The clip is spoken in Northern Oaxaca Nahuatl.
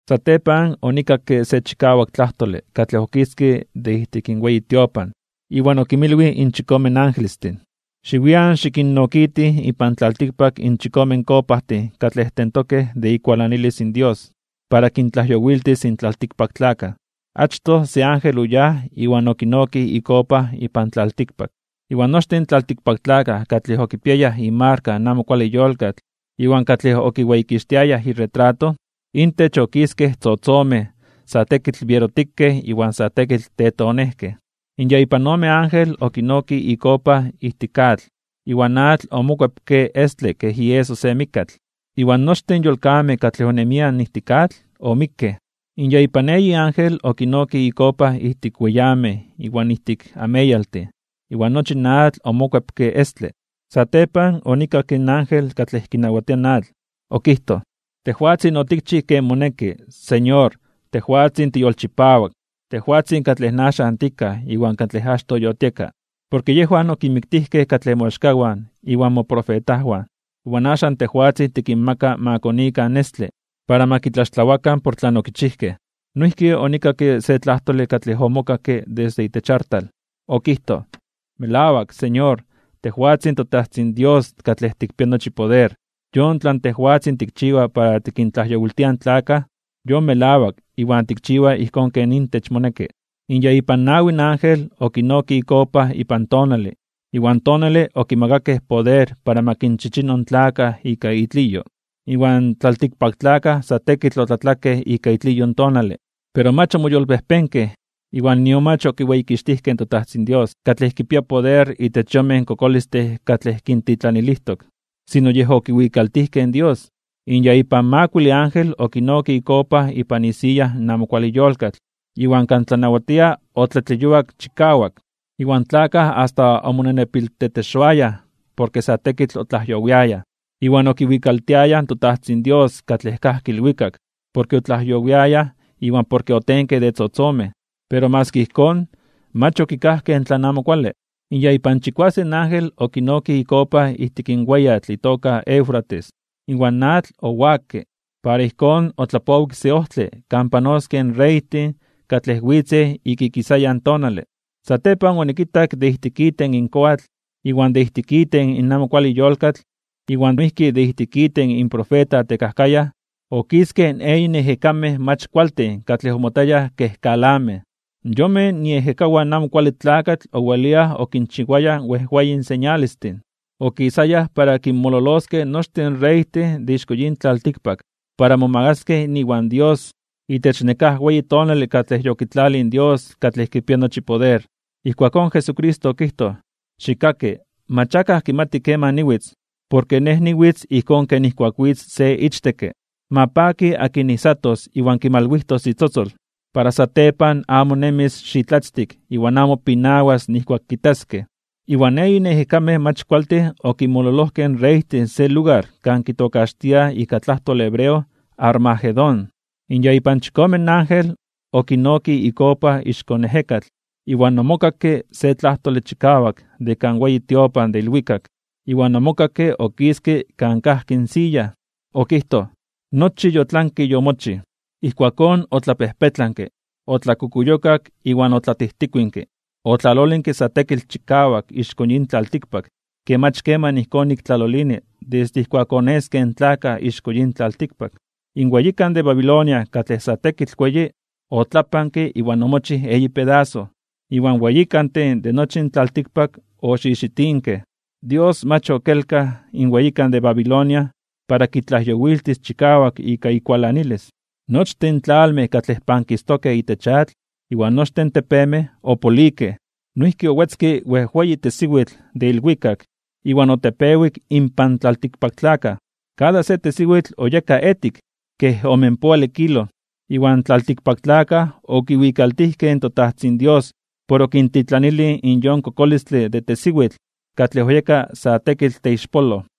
Satepan onikakke se chikawak tlajtole katlej okiske de ijtik in weyi tiopan, iwan okinmilwij in chikome angelestin: ―Xiwian xikinnokitij ipan tlaltikpak in chikome kopajtin katlej tentokej de ikualanilis in Dios, para kintlajyowiltis in tlaltikpaktlakaj. Achtoj se ángel oyáj iwan okinokij ikopa ipan tlaltikpak, iwan nochtin in tlaltikpaktlakaj katlej okipiayaj imarka in amo kuale yolkatl iwan katlej okiweyikixtiayaj iretrato, intech okiskej tzotzomej sa tekitl bierotikej iwan sa tekitl tetonejkej. In ya ipan ome ángel okinokij ikopa ijtik atl, iwan in atl omokuepke estle kej ieso se mikkatl, iwan nochtin in yolkamej katlej onemiaj ijtik atl omikkej. In ya ipan eyi ángel okinokij ikopa ijtik weyamej iwan ijtik ameyaltin, iwan nochi in atl omokuepke estle. Satepan onikakke in ángel katlej kinawatia in atl. Okijtoj: ―Tejwatzin otikchij ken moneki, Señor, tejwatzin tiyolchipawak, tejwatzin katlej axan tikaj iwan katlej achtoj yotieka. Porke yejwan okinmiktijkej katlej moaxkawan iwan moprofetajwan. Iwan axan tejwatzin tikinmaka ma konikan estle, para ma kitlaxtlawakan por tlan okichijkej. Noijki onikakke se tlajtole katlej omokakke desde itech artal. Okijtoj: ―Melawak, Señor, tejwatzin toTajtzin Dios katlej tikpia nochi poder, yon tlan tejwatzin tikchiwa para tikintlajyowiltia in tlakaj, yon melawak iwan tikchiwa ijkón ken intech moneki. In ya ipan nawi ángel okinokij ikopa ipan tonale, iwan tonale okimakakej poder para ma kinchichino in tlakaj ika itliyo. Iwan tlaltikpaktlakaj sa tekitl otlatlakej ika itliyo in tonale, pero mach omoyolpejpenkej (omoyolkuepkej) iwan nion mach okiweyikixtijkej in toTajtzin Dios, katlej kipia poder itech in yonmej kokolistin katlej kintitlanilijtok, sino yej okiwikaltijkej in Dios. In ya ipan makuile ángel okinokij ikopa ipan isiya in amo kuale yolkatl, iwan kan tlanawatia otlatleyuak chikawak. Iwan tlakaj asta omonenepiltetexoayaj porke sa tekitl otlajyowiayaj. Iwan okiwikaltiayaj in toTajtzin Dios katlej kajki ilwikak, porke otlajyowiayaj iwan porke otenkej de tzotzomej, pero maski ijkón, mach okikajkej tlan amo kuale. In ya ipan chikuasen ángel okinokij ikopa ijtik in weyatl itoka Eufrates, iwan in atl owakke, para ijkón otlapowik se ojtle kan panoskej in reytin katlej witzej ik ikisayan tonale. Satepan onikitak de ijtik iten in koatl, iwan de ijtik iten in amo kuale yolkatl, iwan noijki de ijtik iten in profeta tekajkayaj, okiskej eyin ejekamej mach kualtin katlej omotayaj kej kalamej (ranas). Yonmej iejekawan in Amo Kuale Tlakatl oweliaj okinchiwayaj wejweyin señalestin. Okisayaj para kinmololoskej nochtin reytin de ixko yin tlaltikpak para momagaskej (momakaskej) iwan Dios itech nekáj weyi tonale katlej yokitlalij in Dios katlej kipia nochi poder. Ijkuakón Jesucristo okijtoj: “Xikkaki, mach akaj kimati keman niwitz, porke Nej niwitz ijkón ken nijkuak witz se ichtekke. Ma paki akin ijsatos iwan kimalwijtos itzotzol, para satepan amo nemis xitlatztik iwan amo pinawas nijkuak kitaskej.” Iwan eyin ejekamej mach kualtin okinmololojkej in reytin se lugar kan kitokaxtiaj ika tlajtole hebreo Armagedón. In ya ipan chikome ángel okinokij ikopa ixko ejekatl, iwan omokakke se tlajtole chikawak de kan weyi tiopan de ilwikak, iwan omokakke okiske kan kajki in siya. Okijtoj: ―Nochi yotlanke yomochij. Ijkuakón otlapejpetlanke, otlakukuyokak iwan otlatijtikuinke. Otlalolinke sa tekitl chikawak ixko yin tlaltikpak ke mach keman ijkón nik tlalolini desde ijkuak oneskej in tlakaj ixko yin tlaltikpak. In weyikan de Babilonia katlej sa tekitl weyi, otlapanke iwan omochij eyi pedaso, iwan in weyikantin de nochi in tlaltikpak oxixitinkej. Dios mach okelkaj in weyikan de Babilonia para kitlajyowiltis chikawak ika ikualanilis. Nochtin in tlalmej katlej pankistokej itech atl iwan nochtin in tepemej opolikej. Noijki owetzke wejweyi tesiwitl de ilwikak iwan otepewik inpan tlaltikpaktlakaj. Kada se tesiwitl oyeka etik kej omenpoale kilo. Iwan tlaltikpaktlakaj okiwikaltijkej in toTajtzin Dios por okintitlanilij yon kokolistle de tesiwitl katlej oyeka sa tekitl teixpoloj.